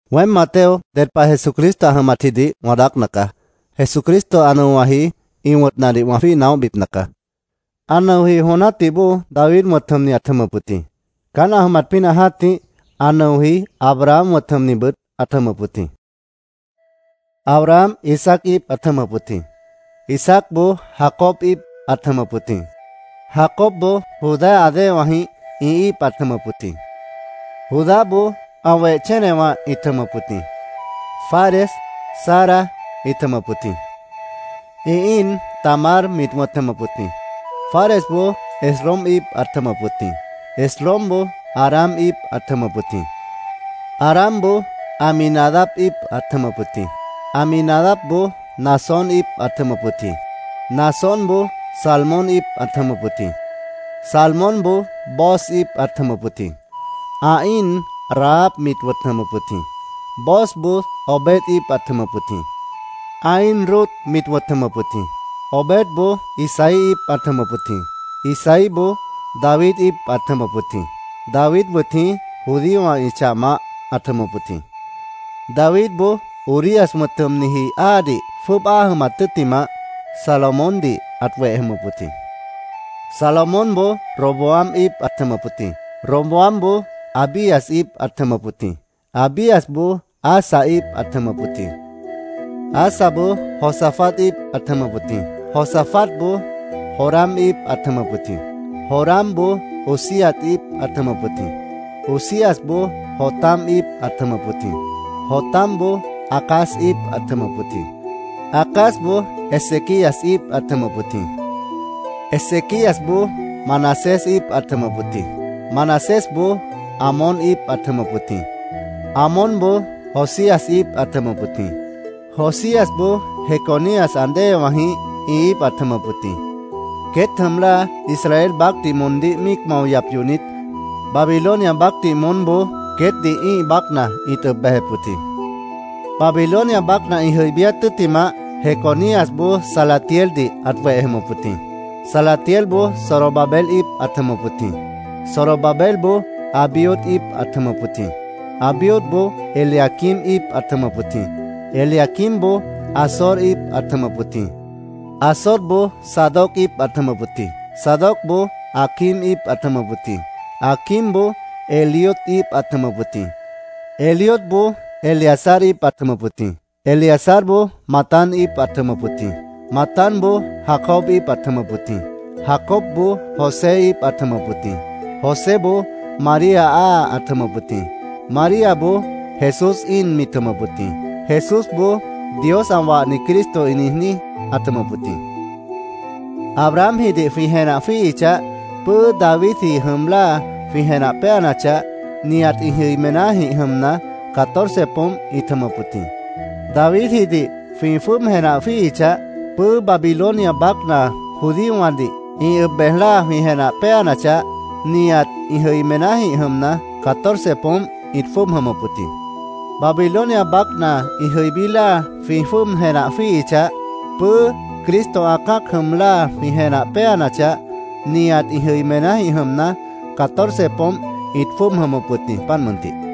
Weém, Mateo, ded pah Jesucristo ã jʉmatjidih wã daácna caá. Jesucristo ã nʉowãji ĩ wʉ̃tnadih wã jwíih naóhbipna caá. Ã nʉoji jon jã́tih bóo David wʉ̃t jʉmni ãt jʉmʉp wʉt jĩ. Caán ã jʉmat pínah jã́tih ã nʉoji Abraham wʉ̃t jʉmnibʉt ãt jʉmʉp wʉt jĩ. Abraham Isaac íip ãt jʉmʉp wʉt jĩ. Isaacboó Jacob íip ãt jʉmʉp wʉt jĩ. Jacobboó Judá ã déewãjĩh ĩ íip ãt jʉmʉp wʉt jĩ. Judáboó ã weh chénewã ĩt jʉmʉp wʉt jĩ. Fares, Zara ĩt wʉ̃t jʉmʉp wʉt jĩ. Ĩ íin Tamar mit wʉ̃t jʉmʉp wʉt jĩ. Faresboó Esrom íip ãt jʉmʉp wʉt jĩ. Esromboó Aram íip ãt jʉmʉp wʉt jĩ. Aramboó Aminadab íip ãt jʉmʉp wʉt jĩ. Aminadabboó Naasón íip ãt jʉmʉp wʉt jĩ. Naasónboó Salmón íip ãt jʉmʉp wʉt jĩ. Salmónboó Booz íip ãt jʉmʉp wʉt jĩ. Ã íin Rahab mit wʉ̃t jʉmʉp wʉt jĩ. Boozboó Obed íip ãt jʉmʉp wʉt jĩ. Ã íin Rut mit wʉ̃t jʉmʉp wʉt jĩ. Obedboó Isaí íip ãt jʉmʉp wʉt jĩ. Isaíboó David íip ãt jʉmʉp wʉt jĩ. David wʉt jĩí judíowã ĩ chah maáh ãt jʉmʉp wʉt jĩ. Davidboó Urías wʉ̃t jʉmniji áadih jwʉ́ʉb áa jʉmat tʉ́ttimah, Salomóndih ãt weh jʉmʉp wʉt jĩ. Salomónboó Roboam íip ãt jʉmʉp wʉt jĩ. Roboamboó Abías íip ãt jʉmʉp wʉt jĩ. Abíasboó Asa íip ãt jʉmʉp wʉt jĩ. Asaboó Josafat íip ãt jʉmʉp wʉt jĩ. Josafatboó Joram íip ãt jʉmʉp wʉt jĩ. Joramboó Uzías íip ãt jʉmʉp wʉt jĩ. Uzíasboó Jotam íip ãt jʉmʉp wʉt jĩ. Jotamboó Acaz íip ãt jʉmʉp wʉt jĩ. Acazboó Ezequías íip ãt jʉmʉp wʉt jĩ. Ezequíasboó Manasés íip ãt jʉmʉp wʉt jĩ. Manasésboó Amón íip ãt jʉmʉp wʉt jĩ. Amónboó Josías íip ãt jʉmʉp wʉt jĩ. Josíasboó Jeconías ã déewãjĩh ĩ íip ãt jʉmʉp wʉt jĩ. Queét jʉm láa Israel baácdih moondíh míic mao yap yohnit, Babilonia baácdih moónboó queétdih ĩ́ih baácna ĩt ʉb bejep wʉt jĩ. Babilonia baácna ĩ jʉibíát tʉ́ttimah, Jeconíasboó Salatieldih ãt weh jʉmʉp wʉt jĩ. Salatielboó Zorobabel íip ãt jʉmʉp wʉt jĩ. Zorobabelboó Abiud íip ãt jʉmʉp wʉt jĩ. Abiudboó Eliaquim íip ãt jʉmʉp wʉt jĩ. Eliaquimboó Azor íip ãt jʉmʉp wʉt jĩ. Azorboó Zadoc íip ãt jʉmʉp wʉt jĩ. Zadocboó Aquim íip ãt jʉmʉp wʉt jĩ. Aquimboó Eliud íip ãt jʉmʉp wʉt jĩ. Eliudboó Eleazar íip ãt jʉmʉp wʉt jĩ. Eleazarboó Matán íip ãt jʉmʉp wʉt jĩ. Matánboó Jacob íip ãt jʉmʉp wʉt jĩ. Jacobboó José íip ãt jʉmʉp wʉt jĩ. Joséboó María áa ãt jʉmʉp wʉt jĩ. Maríaboó Jesús íin mit jʉmʉp wʉt jĩ. Jesúsboó Dios ã wahni Cristo ĩ niijní ãt jʉmʉp wʉt jĩ. Abrahamjidih jwĩ jenah jwíihichah, pʉ́ʉ́ Davidji jʉm láa jwĩ jenah péanachah, nihat ĩ jʉimenájĩh jʉmna, catorce poómp ĩt jʉmʉp wʉt jĩ. Davidjidih jwĩ jwʉ́ʉb jenah jwíihichah, pʉ́ʉ́ Babilonia baácna judíowãdih ĩ ʉb bej láa jwĩ jenah péanachah, nihat ĩ jʉimenájĩh jʉmna, catorce poómp ĩt jwʉ́ʉb jʉmʉp wʉt jĩ. Babilonia baácna ĩ jʉibí láa jwĩ jwʉ́ʉb jenah jwíihichah, pʉ́ʉ́ Cristo ã cã́ac jʉm láa jwĩ jenah péanachah, nihat ĩ jʉimenájĩh jʉmna, catorce poómp ĩt jwʉ́ʉb jʉmʉp wʉt jĩ, páant mʉntih.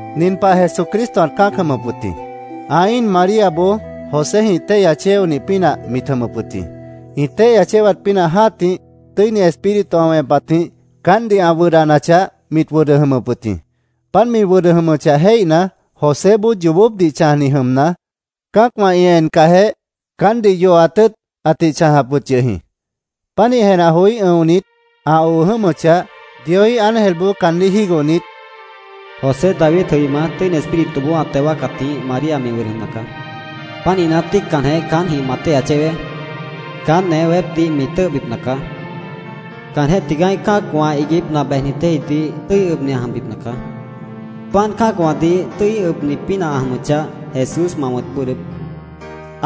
Nin pah Jesucristo ãt cã́ac jʉmʉp wʉt jĩ. Ã íin Maríaboó Joséjĩh téihya chéonih pínah mit jʉmʉp wʉt jĩ. Ĩ téihya chéwat pínah jã́tih Tʉ́ini Espíritu ã wẽpatjĩh caántdih ã wʉdhdanachah, mit wʉdʉ jʉmʉp wʉt jĩ. Páant mi wʉdʉ jʉmʉchah jéihna, Joséboó yoobópdih chãjni jʉmna, cã́acwã ĩ encahjeh, caántdih yohat tʉ́ʉt ãtih chãjap wʉt yʉh jĩ. Pánih jenah joí ʉ̃onit, ã oo jʉ́mʉchah, Dioíh ángelboó caandíh jígohnit, “José, Davidji jʉima, Tʉ́ini Espírituboó ã teo wáacatjĩh María mi wʉdʉ jʉmna caá. Pánihna, tíiccanjeh caántjĩh ma téihya chéweé. Caánt newé weépdih mi tʉ́ʉhbipna caá. Caanjéh tigaá ã́ih cã́acwã iiguípna bejnit déejidih tʉ́i ʉbni ã jʉmbipna caá. Páant cã́acwãdih tʉ́i ʉbni pínah ã jʉmʉchah, Jesús ma wʉ̃t bʉ́ʉdhdʉ́p”,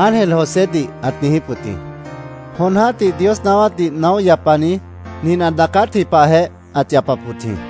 ángel Josédih ãt niijíp wʉt jĩ. Jon jã́tih Dios naáwátdih naóh yapani nin ã daacátji pahjeh ãt yapap wʉt jĩ: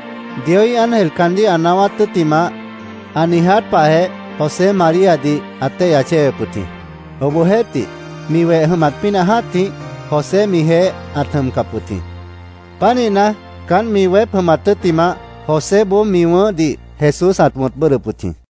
Dioíh ángel caandíh ã naáwát tʉ́ttimah, ã niiját pahjeh José Maríadih ãt téihya chéwep wʉt jĩ. Obohjeéhtih, mi weh jʉmat pínah jã́tih, José mijeéh ãt jʉmcap wʉt jĩ. Pánihna, caánt mi weép jʉmat tʉ́ttimah, Joséboó mi wʉ̃ʉ́hdih Jesús ãt wʉ̃t bʉ́ʉdhdʉp wʉt jĩ.